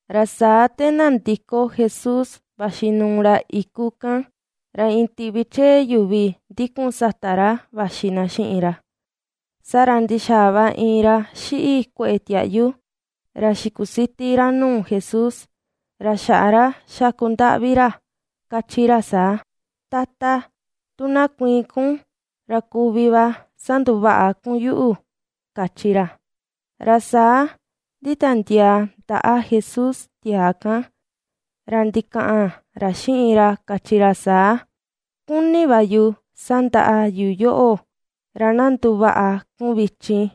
Ra saa te nandiko Jesús vaxi nuu ra iku kan, ra iin tiꞌvi chee yuvi ndikun sata ra vaxi na xiꞌin ra. Saa ra ndixaa va iin ra xiꞌi kueꞌe tiaꞌyu, ra xikusiti ra nuu Jesús, ra xaꞌa ra xaku ndaꞌvi ra, ^kachi ra saa: ―Tata, tu na kuiin kun ra kuvi va sanduvaꞌa kun yuꞌu ―kachi ra. Ra saa nditiandiaa ndaꞌa Jesús tiaa kan, ra ndikaꞌan ra xiꞌin ra kachi ra saa: ―Kuni va yu sandaꞌa yu yoꞌo, ra na nduvaꞌa kun vichin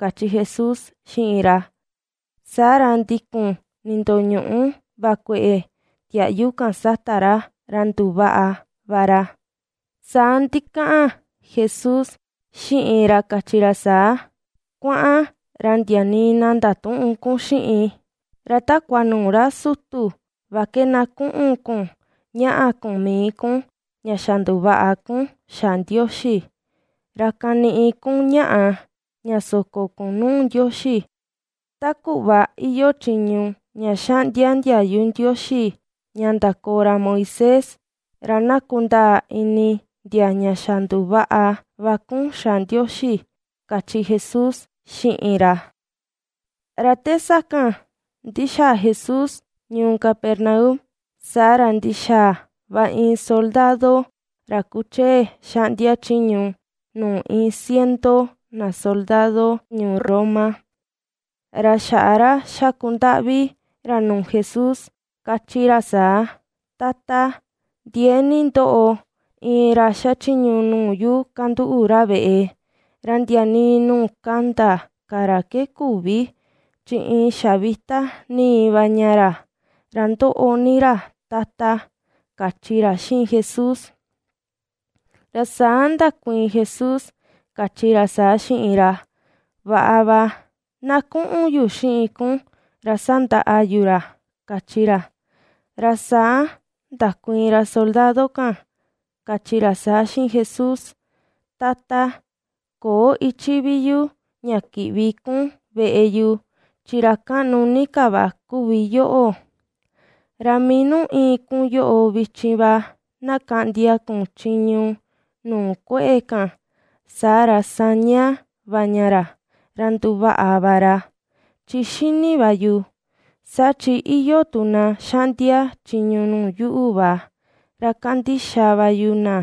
―kachi Jesús xiꞌin ra. Saa ra ndikun nindoñuꞌu va kueꞌe tiaꞌyu kan sata ra, ra nduvaꞌa va ra. Saa ndikaꞌan Jesús xiꞌin ra kachi ra saa: ―Kuaꞌan, ra ndia nii na ndatüꞌun kun xiꞌin, ra takua nuu ra sutu va ke na kuꞌun kun ñaꞌa kun mii kun, ña xa nduvaꞌa kun xa Ndioxi, ra kaniꞌi kun ñaꞌa ña soko kun nuu Ndioxi, ta kuꞌva iyoo chiñu ña xaꞌndia ndiayu Ndioxi ña ndakoo ra Moisés. Ra na kundaa ini ndia ña xa nduvaꞌa va kun xa Ndioxi ―kachi Jesús xiꞌin ra. Ra te sakan ndixaa Jesús ñuu Capernaum, saa ra ndixaa va iin soldado ra kuchee xaꞌndia chiñu nuu iin ciento na soldado ñuu Roma, ra xaꞌa ra xakundaꞌvi ra nuu Jesús, kachi ra saa: ―Tata, ndiee ni ndoꞌo iin ra xachiñu nuu yu kanduꞌu ra veꞌe, ra ndia nii nuu kanda ka ra ke küvi, chi iin xavita ni va ña ra, ra ndoꞌo ni ra, Tata ―kachi ra xiꞌin Jesús. Ra saa ndakuiin Jesús kachi ra saa xiꞌin ra: ―Vaꞌa va, na kuꞌun yu xiꞌin kun ra sandaꞌa yu ra ―kachi ra. Ra saa ndakuiin ra soldado kan kachi ra saa xiꞌin Jesús: ―Tata, köo ichi vi yu ña kiꞌvi kun veꞌe yu, chi ra kaꞌnu ni ka va kuvi yoꞌo; ra mii nuu íin kun yoꞌo vichin va, na kaꞌndia kun chiñu nuu kueꞌe kan, saa ra, saña va ña ra, ra nduvaꞌa va ra. Chi xini va yu, saa chi iyoo tu na xaꞌndia chiñu nuu yuꞌu va, ra kandixa va yu na;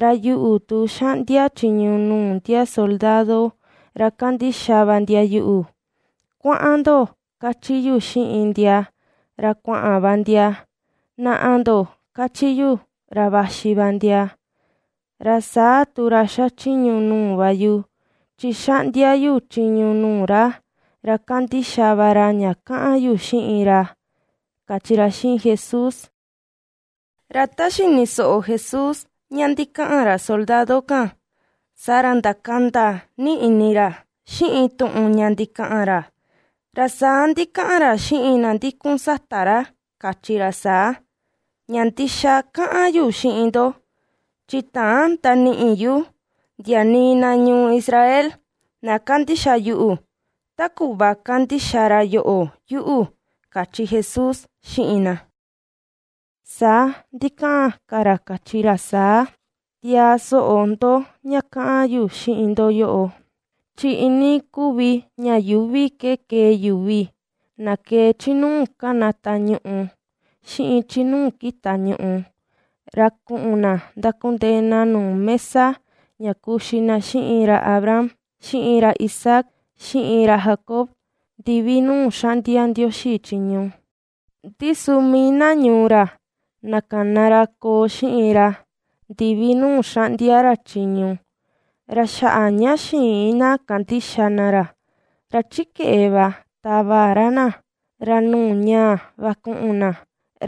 ra yuꞌu tu, xaꞌndia chiñu nuu ndia soldado ra kandixa va ndia yuꞌu: “Kuaꞌan ndo”, ^kachi yu xiꞌin ndia, ra kuaꞌan va ndia; “naꞌa ndo”, ^kachi yu, ra vaxi va ndia. Ra saa tu ra xachiñu nuu va yu, chi xaꞌndia yu chiñu nuu ra, ra kandixa va ra ña kaꞌan yu xiꞌin ra ―kachi ra xiꞌin Jesús. Ra ta xini soꞌo Jesús ña ndikaꞌan ra soldado kan, saa ra ndakanda ni ini ra xiꞌin tuꞌun ña ndikaꞌan ra, ra saa ndikaꞌan ra xiꞌin na ndikun sata ra, kachi ra saa: ―Ña ndixa kaꞌan yu xiꞌin ndo, chi täan ndaniꞌi yu ndia nii na ñuu Israel na kandixa yuꞌu, ta kuꞌva kandixa ra yoꞌo yuꞌu ―kachi Jesús xiꞌin na. Saa ndikaꞌan ka ra kachi ra saa: ―Tiaa soꞌo ndo ña kaꞌan yu xiꞌin ndo yoꞌo. Chi iinii kuvi ña yuuvi ke ke̱e̱ yuvi, na ke̱e̱ chi nuu kanata ñuꞌù xiꞌin chi nuu kita ñuꞌù, ra kuꞌun na ndakundee na nuu mesa ña kuxi na xiꞌin ra Abraham, xiꞌin ra Isaac xiꞌin ra Jacob, ndivi nuu ^xaꞌndia Ndioxi chiñu. Ndi su mii na ñuu ra, na kana ra koo xiꞌin ra ndivi nuu xanꞌdia ra chiñu, ra xaꞌa ña xïin na kandixa na ra, ra chi keꞌe va tava ra na, ra nuu ñáa̱ va ku̱ꞌu̱n na,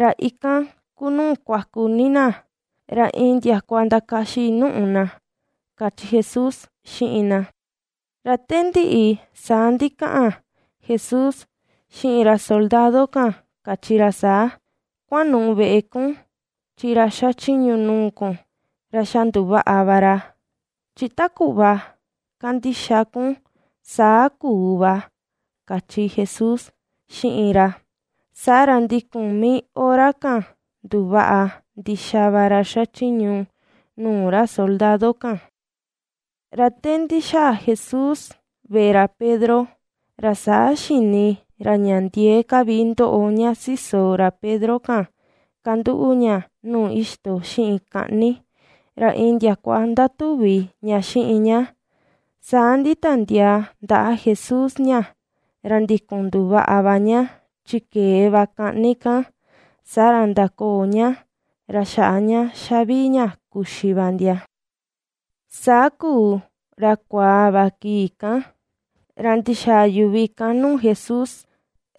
ra ikan kuu nuu kuaku ni na, ra iin ndiakua ndakaxi nùꞌù na ―kachi Jesús xiꞌin na. Ra te ndiꞌi saa ndikaꞌan Jesús xiꞌin ra soldado kan kachi ra saa: ―Kuanuꞌu veꞌe kun, chi ra xachiñu nuu kun, ra xa nduvaꞌa va ra, chi ta kuꞌva ^kandixa kun saa kuu va ―kachi Jesús xiꞌin ra. Saa ra ndikun mii hora kan nduvaꞌa ndixa va ra xachiñu nuu ra soldado kan. Ra te ndixaa Jesús veꞌe ra Pedro, ra saa xini ra ña ndiee ka vi ndoꞌo ña siso ra Pedro kan kanduꞌu ña nuu ixto xiꞌin kaꞌni, ra iin ndiakua ndatuvi ña xiꞌin ña. Saa nditiandiaa ndaꞌa Jesús ña, ra ndikun nduvaꞌa va ña, chi ke̱e va kaꞌni kan, saa ra ndakoo ña, ra xaꞌa ña ^xavii ña kuxi va ndia. Saa kuu ra kuaa va kii kan, ra ndixaa yuvi kan nuu Jesús,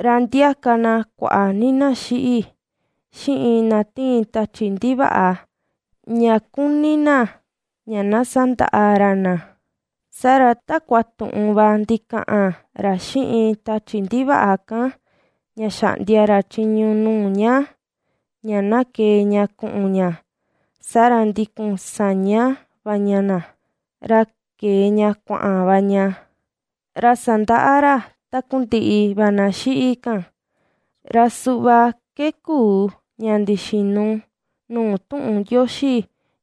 ra ndiaka na kuaꞌa ni na xiꞌi, xiꞌin na tiin tachi ndivaꞌa ña kuni na ña na sandaꞌa ra na. Saa ra takua tuꞌun va ndikaꞌan ra xiꞌin tachi ndivaꞌa kan ña xaꞌndia ra chiñu nuu ña, ña na kee ña kuꞌun ña, saa ra ndikun saña va ña na, ra kee ña kuaꞌan va ña, ra sandaꞌa ra takundiꞌi va na xiꞌi kan. Ra suꞌva ke kuu ña ndixinu nuu tuꞌun Ndioxi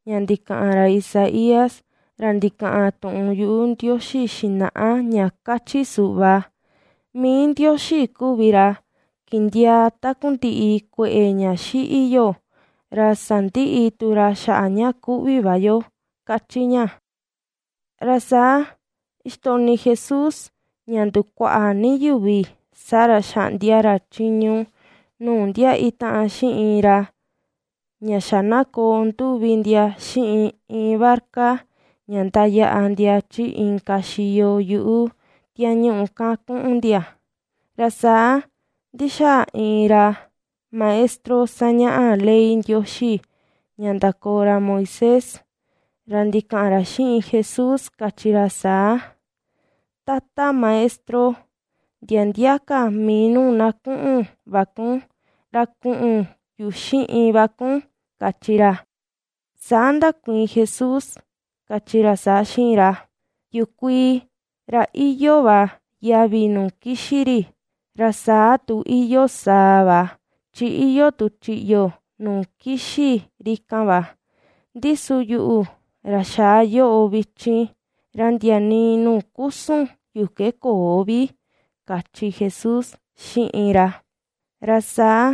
ña ndikaꞌan ra Isaías ra ndikaꞌan tuꞌun yuꞌu Ndioxi xinaꞌa ña kachi suꞌva: “Mii Ndioxi kuvi ra kindiaa takundiꞌi kueꞌe ña xiꞌi yo, ra sandiꞌi tu ra xaꞌa ña kuꞌvi va yo”, kachi ña. Ra saa ixtoꞌni Jesús ña ndukuaꞌa ni yuvi, saa ra xaꞌndia ra chiñu nuu ndia itaꞌan xiꞌin ra ña xa na koo nduvi ndia xiꞌin iin barca ña ndayaꞌa ndia chi inka xiyo yuꞌu tiañuꞌu kan kuꞌun ndia. Ra saa ndixaa iin ra maestro sañaꞌa ley Ndioxi ña ndakoo ra Moisés, ra ndikaꞌan ra xiꞌin Jesús kachi ra saa: ―Tata Maestro, ndia ndia ka mii nuu na kuꞌun va kun, ra kuꞌun yu xiꞌin va kun ―kachi ra. Saa ndakuiin Jesús kachi ra saa xiꞌin ra: ―Yukuii, ra iyoo va yavi nuu kixi ri, ra saa tu iyoo saa va, chi iyoo tu chiꞌyo nuu kixi ri kan va. Ndi su, yuꞌu, ra xaa yoꞌo vichin, ra ndia nii nuu kusun yu ke köo vi ―kachi Jesús xiꞌin ra. Ra saa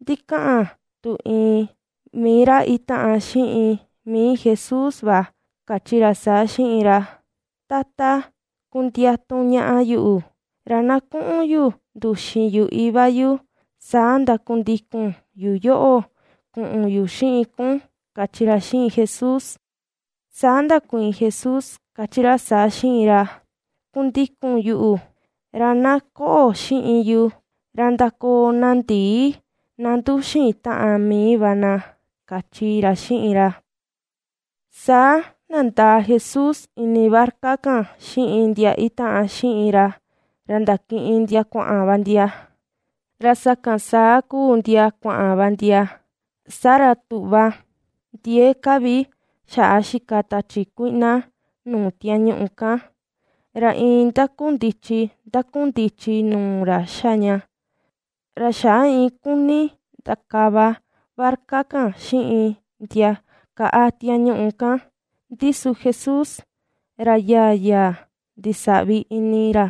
ndikaꞌan tu iin mii ra itaꞌan xiꞌin mii Jesús va kachi ra saa xiꞌin ra: ―Tata, kundiatu ñaꞌa yuꞌu, ra na kuꞌun yu nduxin yu iva yu, saa ndakundikun yu yoꞌo kuꞌun yu xiꞌin kun ―kachi ra xiꞌin Jesús. Saa ndakuiin Jesús kachi ra saa xiꞌin ra: ―Kundikun yuꞌu, ra na koꞌo xiꞌin yu, ra ndakoo na ndii na nduxin taꞌan mii va na ―kachi ra xiꞌin ra. Saa nandaa Jesús ini barca kan xiꞌin ndia itaꞌan xiꞌin ra, ra ndakiꞌin ndia kuaꞌan va ndia. Ra sakan saa kuu ndia kuaꞌan va ndia, saa ra tuꞌva ndiee ka vi xaꞌa xika tachi kuiꞌna nuu tiañuꞌu kan, ra iin ndakundichi ndakundichi nuu ra xa ña, ra xaꞌa iin kuni ndakava barca kan xiꞌin ndia kaꞌa tiañuꞌu kan, ndi su Jesús ra yaa yaa ndisaꞌvi ini ra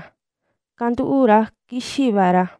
kanduꞌu ra kixi va ra.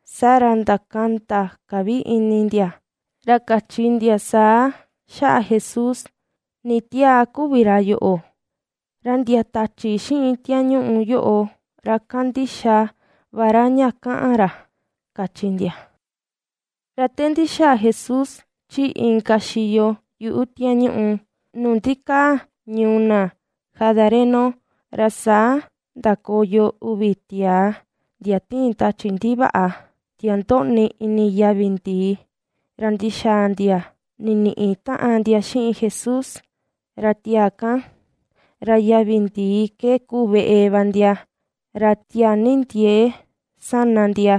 Saa ra ndakanda ka vi ini ndia, ra kachi ndia saa xaꞌa Jesús: ―¿Ni tiaa kuvi ra yoꞌo, ra ndia tachi xiꞌin tiañuꞌu yoꞌo ra kandixa va ra ña kaꞌan ra? ―kachi ndia. Ra te ndixaa Jesús chi inka xiyo yuꞌu tiañuꞌu nuu ndikaa ñuu na Gadareno, ra saa ndakoyo uvi tiaa ndia tiin tachi ndivaꞌa, ndia ndoꞌni ini yavi ndii, ra ndixaa ndia niniꞌi taꞌan ndia xiꞌin Jesús, ra tiaa kan, ra yavi ndii ke kuu veꞌe va ndia, ra tiaa ni ndiee sana ndia,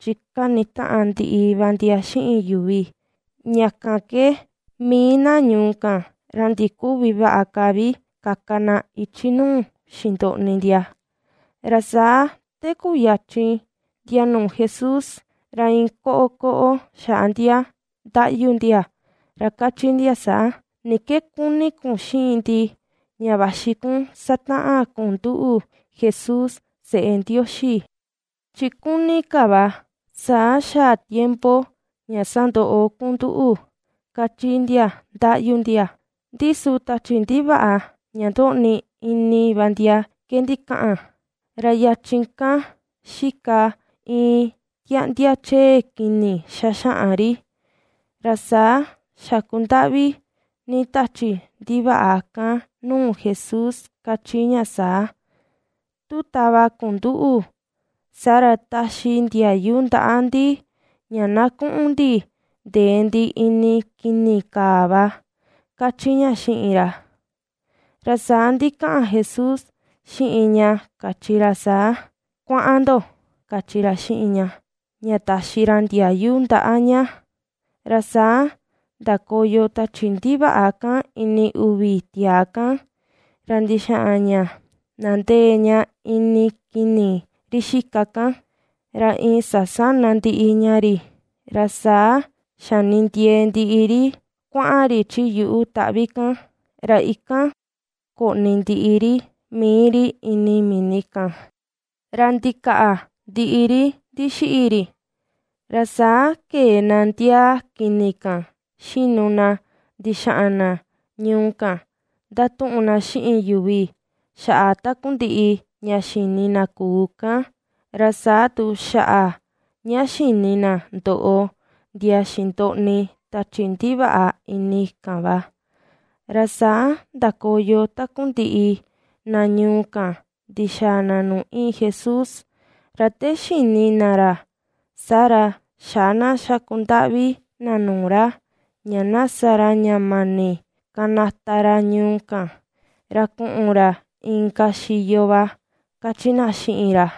chi kani taꞌan ndiꞌi va ndia xiꞌin yuvi. Ña kan ke mii na ñuu kan ra ndiküvi vaꞌa ka vi kaka na ichi nuu xindoꞌni ndia. Ra saa te kuyachin ndia nuu Jesús, ra iin kokoꞌo xaꞌa ndia ndaꞌyu ndia, ra kachi ndia saa: ―¿Ni ke kuni kun xiꞌin ndi ña vaxi kun sataꞌan kun nduꞌu Jesús seꞌe Ndioxi? Chi kuni ka va, saa xaa tiempo ña sandoꞌo kun nduꞌu ―kachi ndia ndaꞌyu ndia. Ndi su tachi ndivaꞌa ña ndoꞌni ini va ndia ke ndikaꞌan. Ra yachin kan xika iin tiaꞌndia chee kini xaxaꞌan ri. Ra saa xakundaꞌvi ni tachi ndivaꞌa kan nuu Jesús kachi ña saa: ―Tu tava kun nduꞌu, saa ra, taxi ndiayu ndaꞌa ndi ña na kuꞌun ndi ndee ndi ini kini kaa va ―kachi ña xiꞌin ra. Ra saa ndikaꞌan Jesús xiꞌin ña kachi ra saa: ―Kuaꞌan ndo ―kachi ra xiꞌin ña, ña taxi ra ndiayu ndaꞌa ña. Ra saa ndakoyo tachi ndivaꞌa kan ini uvi saa tiaa kan, ra ndixaꞌan ña nandee ña ini kini ri xika kan, ra iin sasána ndiꞌi ña ri, ra saa xanindiee ndiꞌi ri kuaꞌan ri chi yuꞌu iin taꞌvi kan, ra ikan koꞌni ndiꞌi ri mii ri ini mini kan, ra ndikaandiaa ndiꞌi ri ndixiꞌi ri. Ra saa kee na ndiaa kini kan xinu na ndixaꞌan na ñuu kan ndatuꞌun na xiꞌin yuvi xaꞌa takundiꞌi ña xini na kuu kan, ra saa tu xaꞌa ña xini na ndoꞌo ndia xindoꞌni tachi ndivaꞌa ini kan va. Ra saa ndakoyo takundiꞌi na ñuu kan ndixaa na nuu iin Jesús, ra te xini na ra, saa ra, xaꞌa na xakundaꞌvi na nuu ra, ña na sa ra ña mani kanata ra ñuu kan, ra kuꞌun ra inka xiyo va kachi na xiꞌin ra.